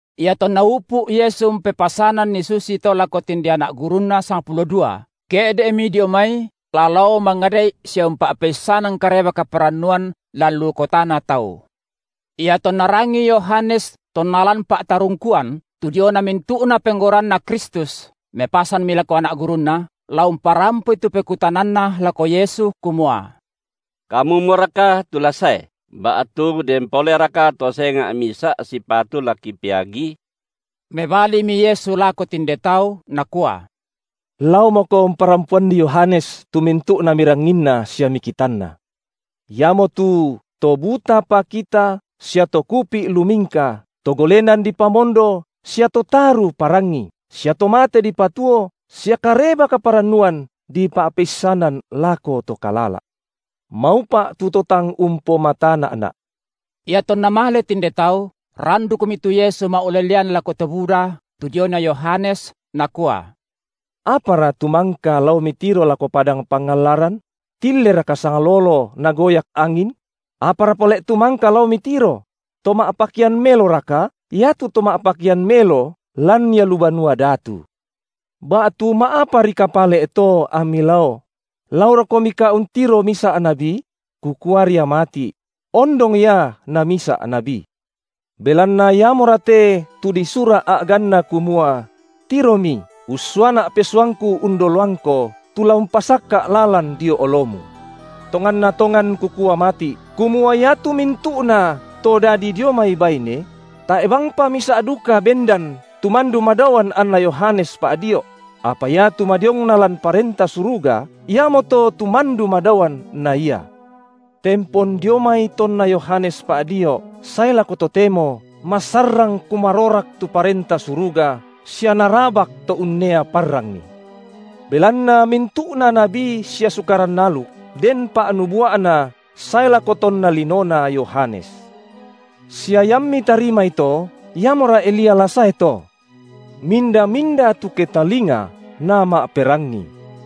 Iatonna upu’ Yesu umpepasananni susito lako tinde Anak gurunNa sangpulo dua, ke’de’Mi dio mai la lao mangada’i sia umpa’peissanan Kareba kaparannuan lan lu kotana tau. Iatonna rangii Yohanes tonna lan pa’tarungkuan tu diona mintu’na penggauranNa Kristus, mepasanmi lako anak gurunna, la umparampoi tu pekutananna lako Yesu kumua: Kamumoraka tu la sae, ba’tu den poleraka to senga’ misa’ sipatu la kipeagi? Mebalimi Yesu lako tinde tau, Nakua: Laomoko parampoanni Yohanes tu mintu’na miranginna sia mikitanna. Iamotu to buta pakita sia to kupi’ lumingka, to golenan dipamondo sia to taru parangi, sia to mate dipatuo sia Kareba kaparannuan dipa’peissanan lako to kalala’. Maupa’ tu to tang umpomatana’Na’. Iatonna male tinde tau, randukmi tu Yesu ma’ulelean lako to buda tu diona Yohanes, Nakua: Apara tu mangka lao mitiro lako padang pangallaran? Tilleraka sanglolo nagoyak angin? Apara pale’ tu mangka lao mitiro? To ma’pakean meloraka? Iatu to ma’pakean melo lan ia lu banua datu. Ba’tu ma’aparika pale’ to ammi lao? laorokomika untiro misa’ nabi? Kukuaria mati’: ondong ia namisa’ nabi. Belanna iamora te, tu disura’ a’ganna kumua: Tiromi ussuaNa’ pesuangKu undoloangKo, tu la umpasakka’ lalan dio oloMu. Tonganna tongan Kukua mati’, kumua iatu mintu’nato dadi dio mai baine, tae’ bangpa misa’ duka bendan, tu mandu madaoan anna Yohanes Pa’dio’; apa iatu madiongna lan Parenta Suruga, iamoto tu mandu madaoan na ia. Tempon dio mai tonna Yohanes Pa’dio’ sae lako totemo masarrang kumarorak tu Parenta Suruga sia narabak to unnea parrangi. Belanna mintu’na nabi sia Sukaran aluk den pa’nubua’na sae lako tonna linona Yohanes. Sia iammi tarimai to: Iamora Elia la sae to. Minda-minda tu ke talinga, nama’perangi.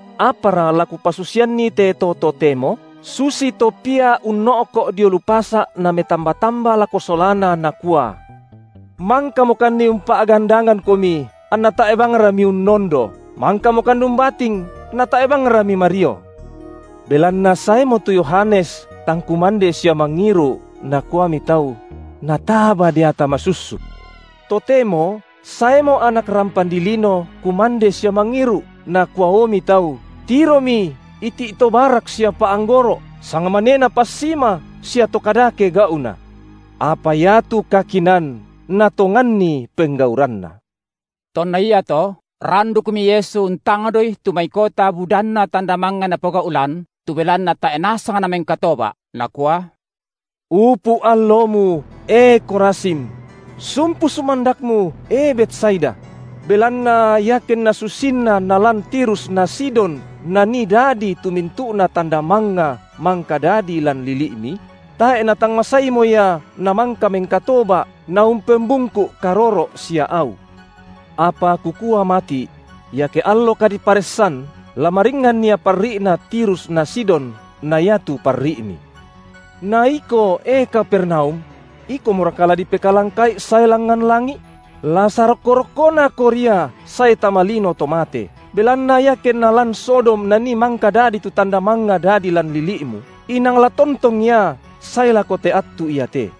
Apara la Kupasusianni te to totemo? Susito pia unno’ko’ dio lu pasa’ nametamba-tamba lako solana, nakua: Mangkamokanni umpa’gandangangkomi, anna tae’ bangra miunnondo, mangkamokan umbating, natae’ bangra mimario. Belanna saemo tu Yohanes tang kumande sia mangiru’, nakuami tau: Nataba deata masussuk. Totemo saemo Anak rampan dilino kumande sia mangiru’, nakuaomi tau: Tiromi iti’ to barak sia pa’anggoro’, sangmanena passima sia to kadake gau’na. Apa iatu kakinaan natonganni penggauranna. Tonna iato, randukmi Yesu untangdoi tu mai kota budanna tanda mangnga Napogau’ lan tu belanna tae’ nasang namengkatoba’, Nakua: Upu’ allomu, E Khorazim! Sumpu sumandakmu, e Betsaida! Belanna iakenna susinna nalan Tirus na Sidon nanni dadi tu mintu’na tanda mangnga mangka dadi lan lili’mi, tae’ natang masaimo ia namangka mengkatoba’ naumpembungku’ karoro’ sia au. Apa Kukua mati’: iake allo kadiparessan la maringan ia parri’na Tirus na Sidon na iatu parri’mi. Na iko, e Kapernaum! Ikomoraka la dipekalangka’i sae langngan langi’? La sarokko-rokkonako ria sae tama lino to mate, belanna iakenna lan Sodom nanii mangka dadi tu tanda mangnga dadi lan lili’mu, inang la tontong ia sae lako te attu iate.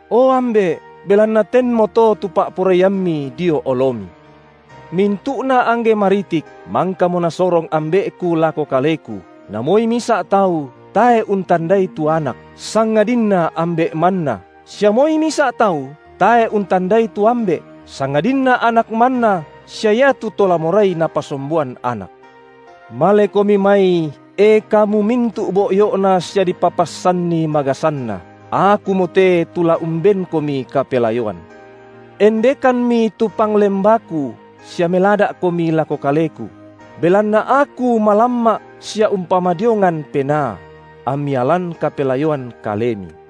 O Ambe’, belanna tenmoto tu pa’poraiamMi dio oloMi. Mintu’na angge maritik mangkamo Nasorong Ambe’Ku lako Kaleku na moi misa’ tau tae’ untandai tu Anak, sangadinna Ambe’ manna, sia moi misa’ tau tae’ untandai tu Ambe’, sangadinna Anak manna sia iatu to la morai Napasomboan Anak. Malekomi mai, e kamu mintu’ boyo’na sia dipapassanni magasanna, Akumote tu la umbenkomi kapelayoan. Endekammi tu panglembaKu sia melada’komi lako Kaleku; belanna Aku malamma’ sia umpamadiongan penaa; ammi alan kapelayoan kalemi.